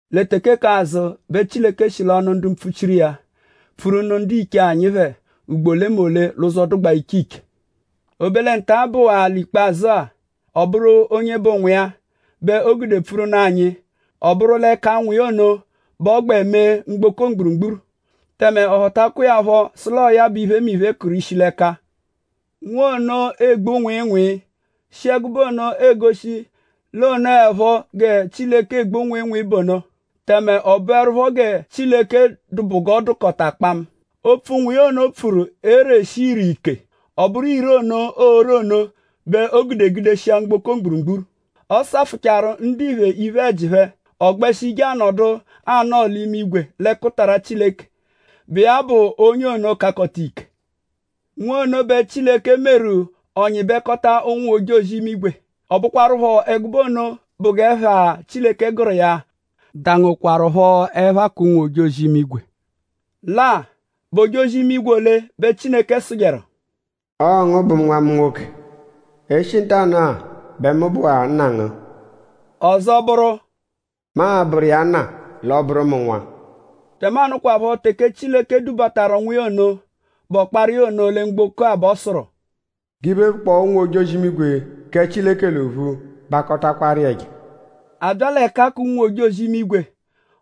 Lẹ teke k'azụ bẹ Chileke shi l'ọnu ndu mpfuchiru iya pfuru nụ ndiche anyi phẹ ugbo olemole l'ụzo, dụgbaa iche iche. O be lẹ nta, bụwaa ikpazụ-a; ọ bụru onye bụ Nwa iya bẹ o gude pfuru nụ anyi. Ọ bụru l'ẹka Nwa iya ono bẹ ọ gbẹ mee mgboko mgburugburu; tẹme ọ họtakwa iya phọ sụ l'ọo ya bẹ iphemiphe kụru ishi l'ẹka. Nwa ono egbu nwịinwii; shi ẹgube ono egoshi l'o nọepho gẹ Chileke egbu nwịinwii bụ ono; tẹme ọ bụerupho gẹ Chileke dụ bụ g'ọ dụkota kpamu. Opfu, Nwa iya ono pfuru ereshi ire ike. Ọ bụru ire ono, oore ono bẹ o gude gudeshia mgboko mgburugburu. Ọ safụchaaru ndiphe iphe-ẹji phẹ; ọ gbẹshi je anọdu anọo l'imigwe l'ẹkutara Chileke, bụ iya bụ onye ono, kakọta ike. Nwa ono bẹ Chileke meru; ọ nyịbekota ụnwu-ojozi-imigwe; ọ bụkwarupho ẹgube ono bụ g'ẹpha, Chileke gụru iya dangokwaruphọ ẹpha k'ụnwu-ojozi-imigwe. Lẹ-a;?bụ ojozi-imigwe ole bẹ Chileke sụjeru: “Ọo ngu bụ Nwa mu nwoke. E -shi ntanụ-a bẹ mu bụwaa Nna ngu.” Ọzo bụru: “Mu a-bụru iya Nna; l'ọo-bụru mu Nwa.” Tẹmanu kwaphọ teke Chileke dubataru Nwa iya ono, bụ ọkpara iya ono lẹ mgboko bẹ ọ sụru: “G'iphe, bụkpoo ụnwu-ojozi-imigwe kẹ Chileke l'ophu bakọtakwaru iya ẹja.” A bya l'ẹka k'ụnwu-ojozi-imigwe;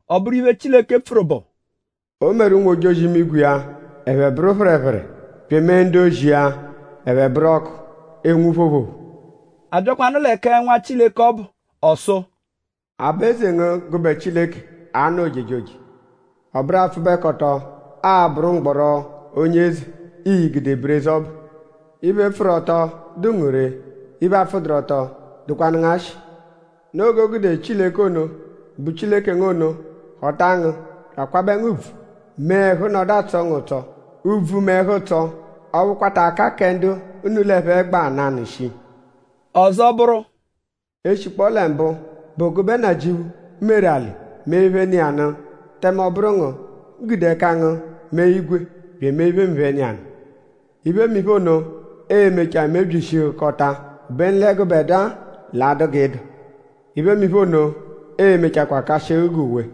ọ bụru iphe, Chileke pfuru bụ: “O meru ụnwu-ojozi-imigwe iya ẹphe bụru phẹrephere; bya emee ndu-ozi iya ẹphe bụru ọku, enwu phoophoophoo.” A byakwanụ lẹ kẹ Nwa Chileke ọbu ọ sụ: “Aba-eze ngu gụbe Chileke a-nọ ojejoje. Ọ bụru apfụbekoto a-bụru mgbọro-onye-eze, ii-gude bụru eze ọbu. Iphe, pfụru ọto dụ ngu ree; iphe, apfụduru-ọto dụkwanu ngu ashị. Noo g'o gude Chileke ono, bụ Chileke ngu ono họta ngu; bya akwabẹ ngu ùbvù; mee ẹhu nọdu atsọ ngu ụtso; ùbvù mẹ ẹhu-ụtso ọphu kwata ka kẹ ndu unu l'ẹphe gba nanụ shii.” Ọzo bụru; “E -shikpọo lẹ mbụ bụ gụbe Nnajịuphu meru alị mee iphe, nọ iya nụ; tẹme ọ bụru ngu gude ẹka ngu mee igwe; bya emee iphemiphe, nọ iya nụ. Iphemiphe ono e-mechaa mebyishihukọta; obenu lẹ gụbedua l'a-dụ g'ị dụ. Iphemiphe ono e-mechakwaa kashịhu g'uwe.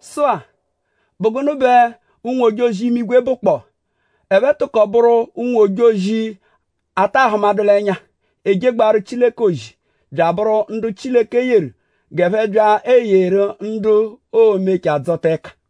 Sụ-a;?bụ gụnu bẹ ụnwu-ojozi-imigwe bụkpoo? Ẹphe tụkoru bụru ụnwu-ojozi, a taa hụmadu l'ẹnya, ejegbaaru Chileke ozi; bya abụru ndu Chileke yeru g'ẹphe bya eyeru ndu oo-mechaa dzọta ẹka.